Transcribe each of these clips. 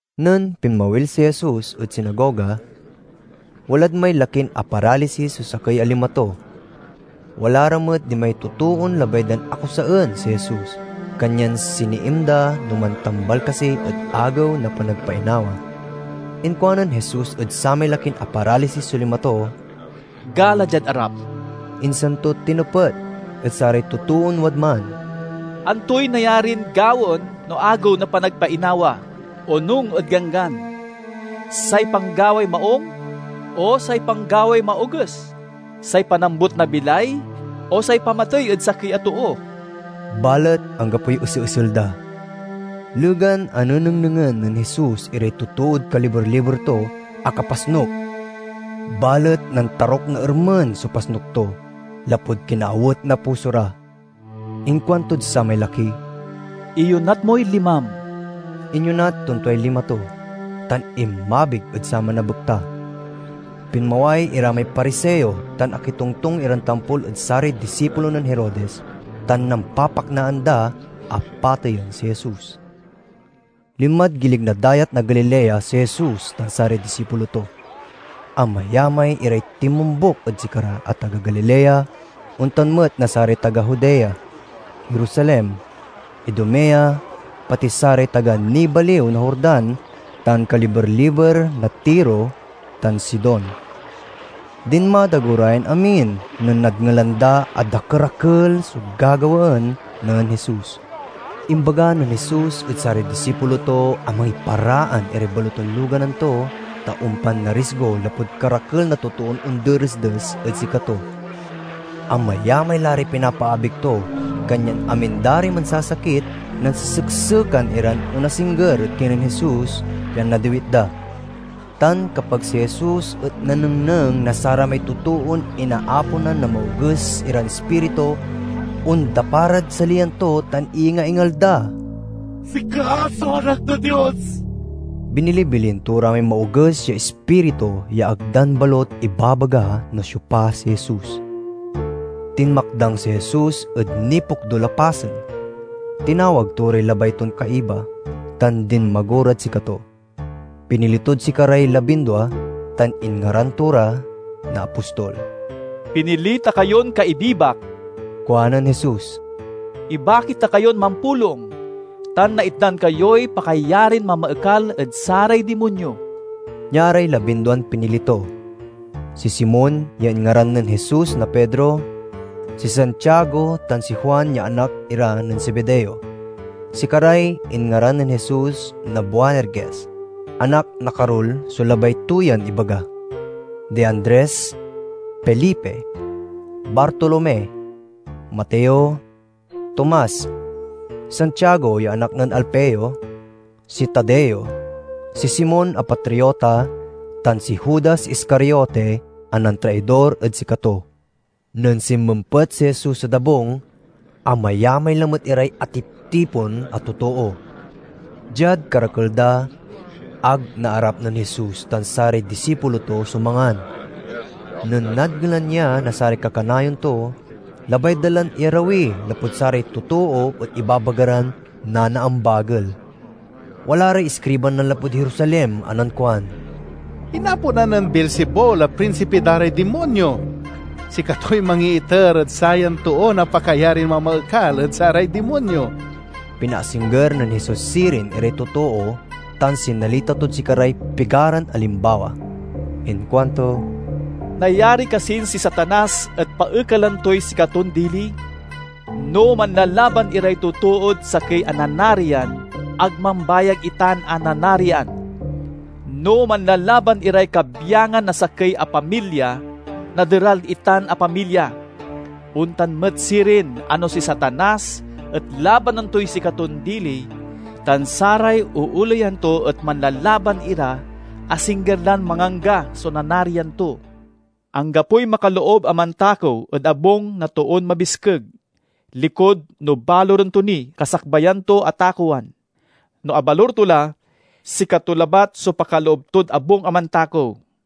Nen pinmawil si Jesus ed sinagoga, walad may lakin aparalisis so sakey a lima to. Wala ra met dimay totoon labay dan akusaen si Jesus, kanyan siniiim da no mantambal kasi ed Agew na Panagpainawa. Inkuanen Jesus ed samay lakin aparalisis so lima to, "Gala diad arap." Insan to tinepet ed saray totoon wadman, "Antoy nayarin gawaen no Agew na Panagpainawa, onung ed Ganggan? Say panggaway maung, o say panggaway maoges? Say panambut na bilay, o say pamatey ed sakey a too?" Balet anggapoy eseesel da. Legan a nenengnengen nen Jesus iray totood kaliber-liber to, akapasnuk; balet nantaruk na ermen so pasnuk to, lapud kinaawet na puso ra. Inkuantod samay laki, "Iyonat moy limam." Inyonat ton tuay lima to, tan inmabig ed saman a bekta. Pinmaway ira may Pariseo tan akitongtong iran tampol ed saray disipulo nen Herodes, tan nampapaknaan da a pateyen si Jesus. Linmad gilig na Dayat na Galilea si Jesus tan saray disipulo to. Amayamay iray tinmombuk ed sikara a taga Galilea; ontan met na saray taga Judea, Jerusalem, Idumea, pati saray taga nibaliw na Jordan tan kaliber-liber na Tiro tan Sidon. Dinmadago ra yan amin nen nadngelan da a dakerakel so gagawaen nen Jesus. Imbaga nen Jesus ed saray disipulo to a mangiparaan iray baloton loganan to, ta ompan narisgo lapud karakel na totoon onderesdes ed sikato. Amayamay la ray pinapaabig to, kanyan amin da ray mansasakit nanseseksekan iran onasingger ed kinen Jesus, pian nadiwit da. Tan kapag si Jesus et nanengneng na saramay totoon inaaponan na maoges iran ispiritu, ondapa rad saliyan to tan iyingaingal da, "Sika so Anak na Dios!" Binilibilin to ra may maoges ya ispiritu ya ag dan balut ibabaga no siopa si Jesus. Tinmakdang si Jesus ed nipokdul a pasen. Tinawag to ray labay ton kaiba, tan dinmago rad sikato. Pinili tod sikaray labindua tan inngaran to ra na apostol. "Pinili ta kayon kaibibak," kuanen Jesus. "Ibaki ta kayon mampulong, tan naitdan kayoy pakayarin mamaekal ed saray dimonyo." Nia ray labinduan pinili to: si Simon ya inngaran nen Jesus na Pedro; si Santiago tan si Juan ya anak ira nen Zebedeo (sikaray inngaran nen Jesus na Boanerges—"Anak na Karul" so labay to yan ibaga); di Andres, Felipe, Bartolome, Mateo, Tomas, Santiago ya anak nen Alfeo; si Tadeo, si Simon a Patriota, tan si Judas Iscariote a nantraidor ed sikato. Nen sinmempet si Jesus ed abung, amayamay lamet iray atiptipon a totoo. Diad karakel da, ag naarap nen Jesus tan saray disipulo to so mangan. Nen nadngelan ya na saray kakanayon to, labay da lan iyarawi lapud saray totoo et ibabaga ran nanaambagel. Wala ray iskriban nanlapud Jerusalem a nankuan, "Inaponan nen Beelzebul a prinsipi da ray dimonyo. Sikatoy mangiiter ed sayan too na pakayarin mamaekal ed saray dimonyo." Pinaasingger nen Jesus sirin iray totoo tan sinalita tod sikaray pigaran alimbawa. Inkuanto, "Nayari kasin si Satanas et paekalen toy sikaton dili? No manlalaban iray totood sakey a nanarian, ag mambayag itan a nanarian. No manlalaban iray kabyangan na sakey a pamilya, naderal itan a pamilya. Ontan met sirin a no si Satanas et labanan toy sikaton dili, tan saray ooleyan to et manlalaban ira, asingger lan mangangga so nanarian to. "Anggapoy makaloob a mantakew ed abung na toon mabiskeg, likud no baluren to ni kasakbayan to a takewan. No abalur to la, sikato labat so pakaloob tod abung a mantakew.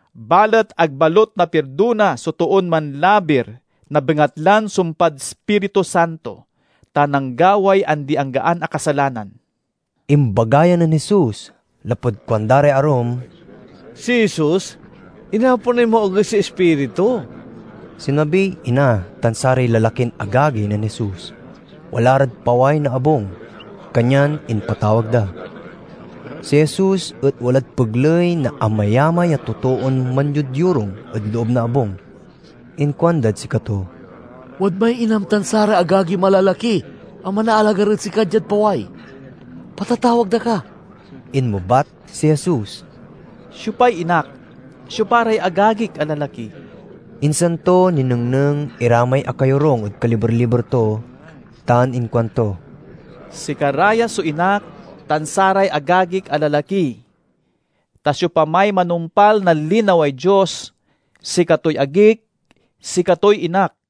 Balet ag balut napirdona so toon manlabir na bengatlan sumpad Ispiritu Santo, ta nanggaway andianggaan a kasalanan." Imbaga ya nen Jesus lapud kuanda ray arum, "Si Jesus inaponay maoges ya ispiritu." Sinmabiy ina tan saray lalakin agagi nen Jesus. Wala rad paway na abung, kanyan impatawag da. Si Jesus et walad pegley na amayamay a totoon manyodyorung ed loob na abung. Inkuandad sikato, "Wadmay inam tan saray agagim a lalaki a manaalagar ed sika diad paway. Patatawag da ka." Inmebat si Jesus, "Siopay inak? Siopa ray agagik a lalaki?" Insan to ninengneng ira may akayorung ed kaliber-liber to tan inkuanto, "Sikara ya so inak tan saray agagik a lalaki! Ta siopamay manumpal na linaway Dios, sikatoy agik, sikatoy inak."